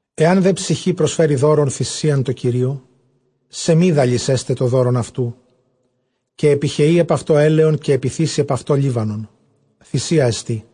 Ἐὰν δὲ ψυχὴ προσφέρῃ δῶρον θυσίαν τῷ Κυρίῳ, σεμίδαλις ἔσται τὸ δῶρον αὐτοῦ, καὶ ἐπιχεεῖ ἐπʼ αὐτὸ ἔλαιον, καὶ ἐπιθήσει ἐπʼ αὐτὸ λίβανον· θυσία ἐστί.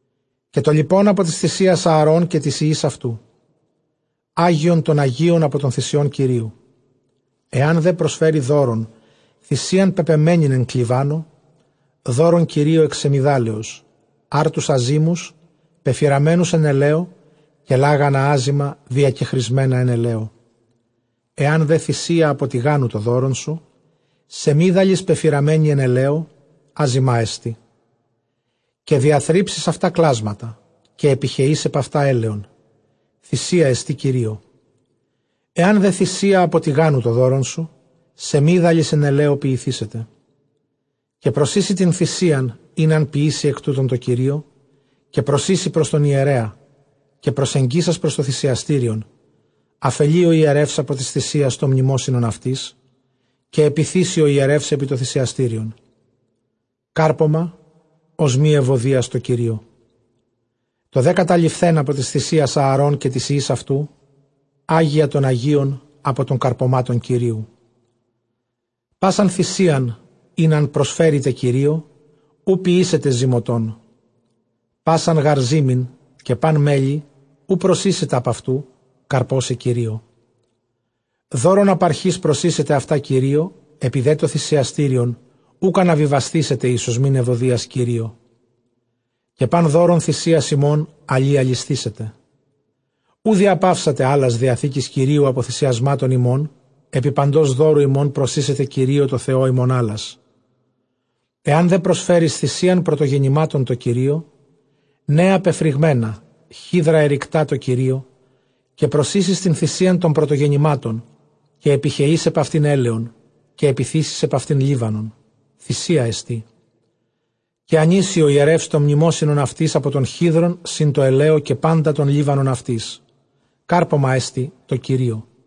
Καὶ τὸ λοιπὸν ἀπὸ τῆς θυσίας Ἀαρὼν καὶ τοῖς υἱοῖς αὐτοῦ, ἅγιον τῶν ἁγίων ἀπὸ τῶν θυσιῶν Κυρίου. Ἐὰν δὲ προσφέρῃ δῶρον θυσίαν πεπεμμένην ἐκ κλιβάνου δῶρον Κυρίῳ ἐκ σεμιδάλεως, ἄρτους ἀζύμους πεφυραμένους ἐν ἐλαίῳ, καὶ λάγανα ἄζυμα διακεχρισμένα ἐν ἐλαίῳ. Ἐὰν δὲ θυσία ἀπὸ τηγάνου τὸ δῶρόν σου, σεμίδαλις πεφυραμένη ἐν ἐλαίῳ ἄζυμά ἐστι. Καὶ διαθρύψεις αὐτὰ κλάσματα, καὶ ἐπιχεεῖς ἐπʼ αὐτὰ ἔλαιον· θυσία ἐστὶ Κυρίῳ. Ἐὰν δὲ θυσία ἀπὸ ἐσχάρας τὸ δῶρόν σου, σεμίδαλις ἐν ἐλαίῳ ποιηθήσεται. Καὶ προσοίσει τὴν θυσίαν ἣν ἂν ποιήσῃ ἐκ τούτων τῷ Κυρίῳ, καὶ προσοίσει πρὸς τὸν ἱερέα. Καὶ προσεγγίσας πρὸς τὸ θυσιαστήριον, ἀφελεῖ ὁ ἱερεὺς ἀπὸ τῆς θυσίας τὸ μνημόσυνον αὐτῆς, καὶ ἐπιθήσει ὁ ἱερεὺς ἐπὶ τὸ θυσιαστήριον, κάρπωμα· ὀσμὴ εὐωδίας Κυρίῳ. Τὸ δὲ καταλειφθὲν ἀπὸ τῆς θυσίας, Ἀαρὼν καὶ τοῖς υἱοῖς αὐτοῦ, ἅγια τῶν ἁγίων ἀπὸ τῶν καρπωμάτων Κυρίου. Πᾶσαν θυσίαν, ἣν ἂν προσφέρητε Κυρίῳ, οὐ ποιήσετε ζυμωτόν· πᾶσαν γὰρ ζύμην, καὶ πᾶν μέλι οὐ προσοίσετε ἀπʼ αὐτοῦ, καρπῶσαι Κυρίῳ δῶρον. Ἀπαρχῆς προσοίσετε αὐτὰ Κυρίῳ, ἐπὶ δὲ τὸ θυσιαστήριον οὐκ ἀναβιβασθήσεται εἰς ὀσμὴν εὐωδίας Κυρίῳ. Καὶ πᾶν δῶρον θυσίας ὑμῶν ἁλὶ ἁλισθήσεται· οὐ διαπαύσατε ἅλας διαθήκης Κυρίου ἀπὸ θυσιασμάτων ὑμῶν· ἐπὶ παντὸς δώρου ὑμῶν προσοίσετε Κυρίῳ τῷ Θεῷ ὑμῶν ἅλας. Ἐὰν δὲ προσφέρῃς θυσίαν πρωτογεννημάτων τῷ Κυρίῳ, νέα πεφρυγμένα χίδρα ἐρικτὰ τῷ Κυρίῳ· καὶ προσοίσεις τὴν θυσίαν τῶν πρωτογεννημάτων. Καὶ ἐπιχεεῖς ἐπʼ αὐτὴν ἔλαιον, καὶ ἐπιθήσεις ἐπʼ αὐτὴν λίβανον· θυσία ἐστί. Καὶ ἀνοίσει ὁ ἱερεὺς τὸ μνημόσυνον αὐτῆς ἀπὸ τῶν χίδρων σὺν τῷ ἐλαίῳ, καὶ πάντα τὸν λίβανον αὐτῆς· κάρπωμά ἐστι Κυρίῳ.